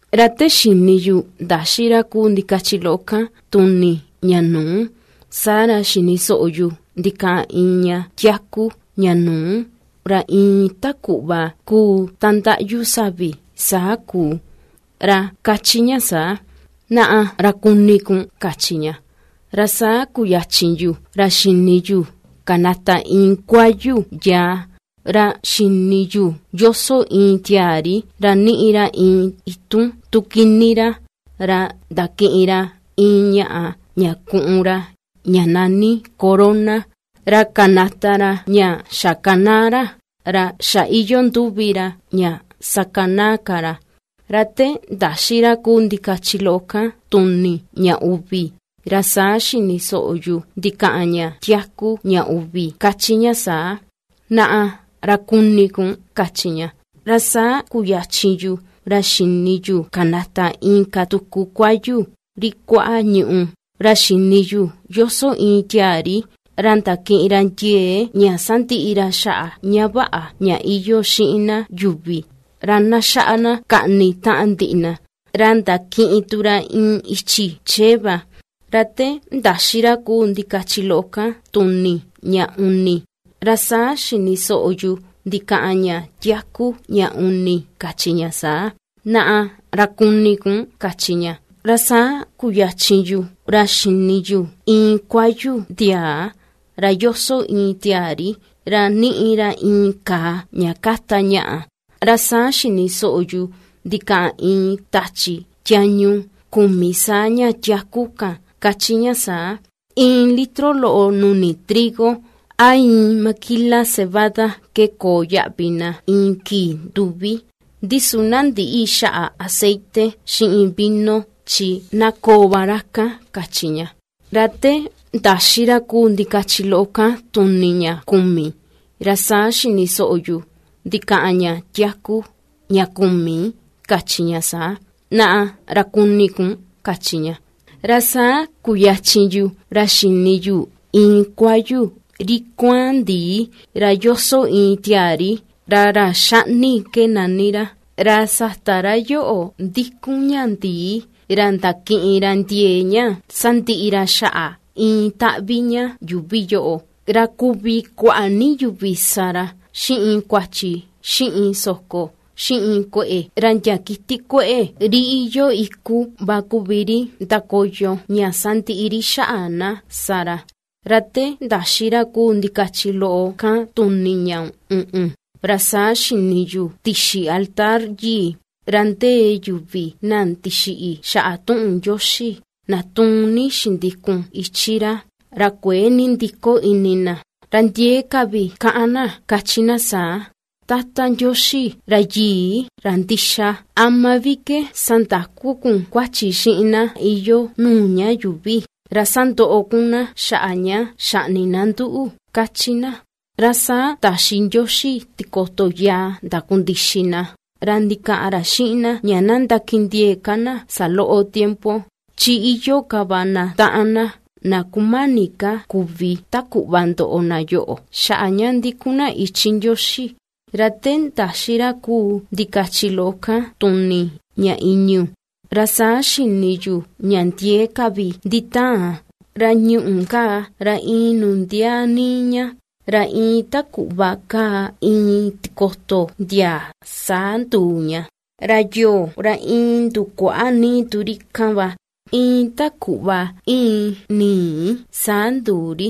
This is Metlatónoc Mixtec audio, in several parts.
Ra te xini yu ndaxi ra kuu ndikachi loꞌo kan tuni ña nuu, saa ra xini soꞌo yu ndikaꞌan iin ña tiaku, ña nuu, ra iin ta kuꞌva kuu ta ndaꞌyu savi saa kuu, ra ^kachi ña saa: ―¡Naꞌa, ra kuni kun! ―kachi ña. Ra saa kuyachin yu ra xini yu kanata iin kuayu yaa, ra xini yu yoso iin tiaa ri, ra ^niꞌi ra iin itun tu kini ra, ra ndakiꞌin ra iin ñaꞌa ña kùꞌùn ra, ña nani corona, ra kanata ra ña xakanaa ra, ra xa iyoo nduvi ra ña sakanaa ka ra. Ra te ndaxi ra kuu ndikachi loꞌo kan tuni ña uvi, ra saa xini soꞌo yu ndikaꞌan ña tiaku ña uvi, ^kachi ña saa: ―¡Naꞌa ra kuni kun! ―kachi ña. Ra saa kuyachin yu ra xini yu kanata inka tuku kuayu, ri kuaꞌa ñùꞌù, ra xini yu ^yoso iin tiaa ri, ra ndakiꞌin ra ndiee ña sandiꞌi ra xaꞌa ña vaꞌa ña iyoo xiin na yuvi, ra na xaꞌa na kaꞌni taꞌan ndiꞌi na, ra ndakiꞌin tu ra iin ichi chee va. Ra te ndaxi ra kuu ndikachi loꞌo kan tuni ña uni, ra saa xini soꞌo yu ndikaꞌan ña tiaku ña uni, kachi ña saa: ―¡Naꞌa ra kuni kun! ―kachi ña. Ra saa kuyachin yu ra xini yu iin kuayu ndiaa, ra ^yoso iin tiaa ri, ra ^niꞌi ra iin kàà ña ^káta ñaꞌa. Ra saa xini soꞌo yu ndikaꞌan iin tachi tiañu kumi saa ña tiaku kan ^kachi ña saa: ―Iin litro loꞌo nuni trigo, a iin maquila cebada ke koo yaꞌvi na iin kii nduvi; ndi su na ndïꞌi xaꞌa aceite xiꞌin vino chi na koo va ra kan ―kachi ña. Ra te ndaxi ra kuu ndikachi loꞌo kan tuni ña kumi, ra saa xini soꞌo yu ndikaꞌan ña tiaku ña kumi, ^kachi ña saa: ―¡Naꞌa ra kuni kun! ―kachi ña. Ra saa kuyachin yu ra xini yu iin kuayu, ri kua̱án ndi̱ì, ra yoso iin tiaa ri, ra ra xaꞌni ke nani ra, ra sata ra yoꞌo ndikun ña ndi̱ì ra ndakiꞌin ra ndiee ña sandiꞌi ra xaꞌa iin taꞌvi ña yuuvi yoꞌo ra kuvi kuaꞌa ni yuvi sa ra xiꞌin kuachi, xiꞌin soko, xiꞌin kueꞌe, ra ndia kiti kueꞌe, ri iyoo iku va kuvi ri ndakoyo ña sandiꞌi ri xaꞌa na sa ra. Ra te ndaxi ra kuu ndikachi loꞌo kan tuni ña uꞌun, ra saa xini yu tixi altar yii, ra ndee yuvi na ndixiꞌi xaꞌa tuꞌun Ndioxi, na tuun ni xindikun ichi ra, ra kuëe nindiko ini na. Ra ndiee ka vi ^kaꞌan na ^kachi na saa: ―Tata Ndioxi, Ra Yii, Ra Ndixa, ¿ama vi ke sandaku kun kuachi xiꞌin na iyoo nuu ña yuuvi, ra sandoꞌo kun na xaꞌa ña xaꞌni na nduꞌu? ―^kachi na. Ra saa taxi Ndioxi tikoto yaa ndakundixi na, ra ndikaꞌan ra xiꞌin na ña na ndakindiee ka na saloꞌo tiempo, chi iyoo ka va na taꞌan na, na kumani ka kuvi ta kuꞌva ndoꞌo na yoꞌo xaꞌa ña ndikun na ichi Ndioxi. Ra te ndaxi ra kuu ndikachi loꞌo kan tuni ña i̱ñu̱, ra saa xini yu ña ndiee ka vi nditaan, ra ñuꞌù kaa, ra iin nundiaa níí ña, iin ta kuꞌva kaa iin tikoto ndiaa, saa nduu ña, ra yoo, ra iin ndukuaꞌa níí tu ri kan va, iin ta kuꞌva íin ni̱i̱ saa nduu ri.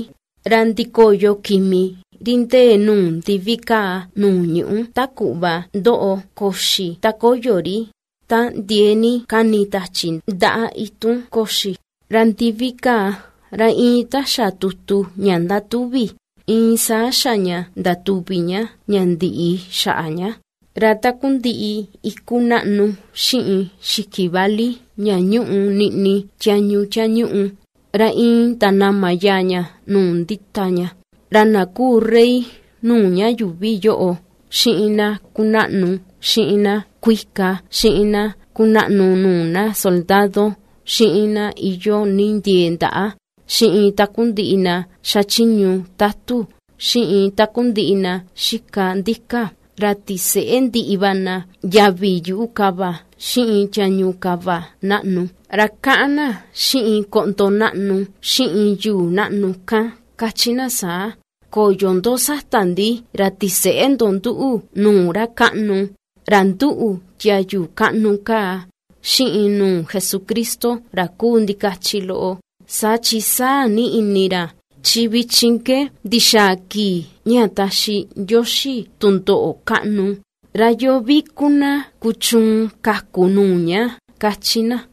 Ra ndikoyo kimi, ri ndee nuu ndivi kaa nuu ñuꞌú, ta kuꞌva ^ndoꞌo koxi ta ^koyo ri, ta ndiee ni ^kani tachi, ndaꞌa itun koxi. Ra ndivi kaa, ra iin ta xa tutu ña ^ndatuvi, iin saa xa ña ndatuvi ña, ña ndiꞌi xaꞌa ña; ra takundiꞌi iku naꞌnu xiꞌin xiki vali ña ñúꞌu niꞌni tiañu tiañuꞌu, ra iin ndanama yaa ña nuu ^ndita ña. Ra na kuu rey nuu ña yuuvi yoꞌo, xiꞌin na kunaꞌnu, xiꞌin na kuika, xiꞌin na kunaꞌnu nuu na soldado, xiꞌin na iyoo ni ndiee ndaꞌa xiꞌin takundiꞌi na xachiñu tatu, xiꞌin takundiꞌi na xika ndika, ra tiseꞌe ndiꞌi va na yavi yuꞌu kava, xiꞌin tiañu kava naꞌnu. Ra kaꞌan na xiꞌin koꞌndo naꞌnu xiꞌin yuu naꞌnu kan ^kachi na saa: ―¡Koyo ndo sata ndi ra tiseꞌe ndo nduꞌu nuu ra kaꞌnu, ra nduꞌu tiayu kaꞌnu kaa, xiꞌin nuu Jesucristo ra kuu ndikachi loꞌo, saa chin sáa̱ ni ini ra! Chi vichin ke ^ndixaa kii ña taxi Ndioxi tundoꞌo kaꞌnu. ¿Ra yoo vi ku na kuchuun kaku nuu ña? ―^kachi na.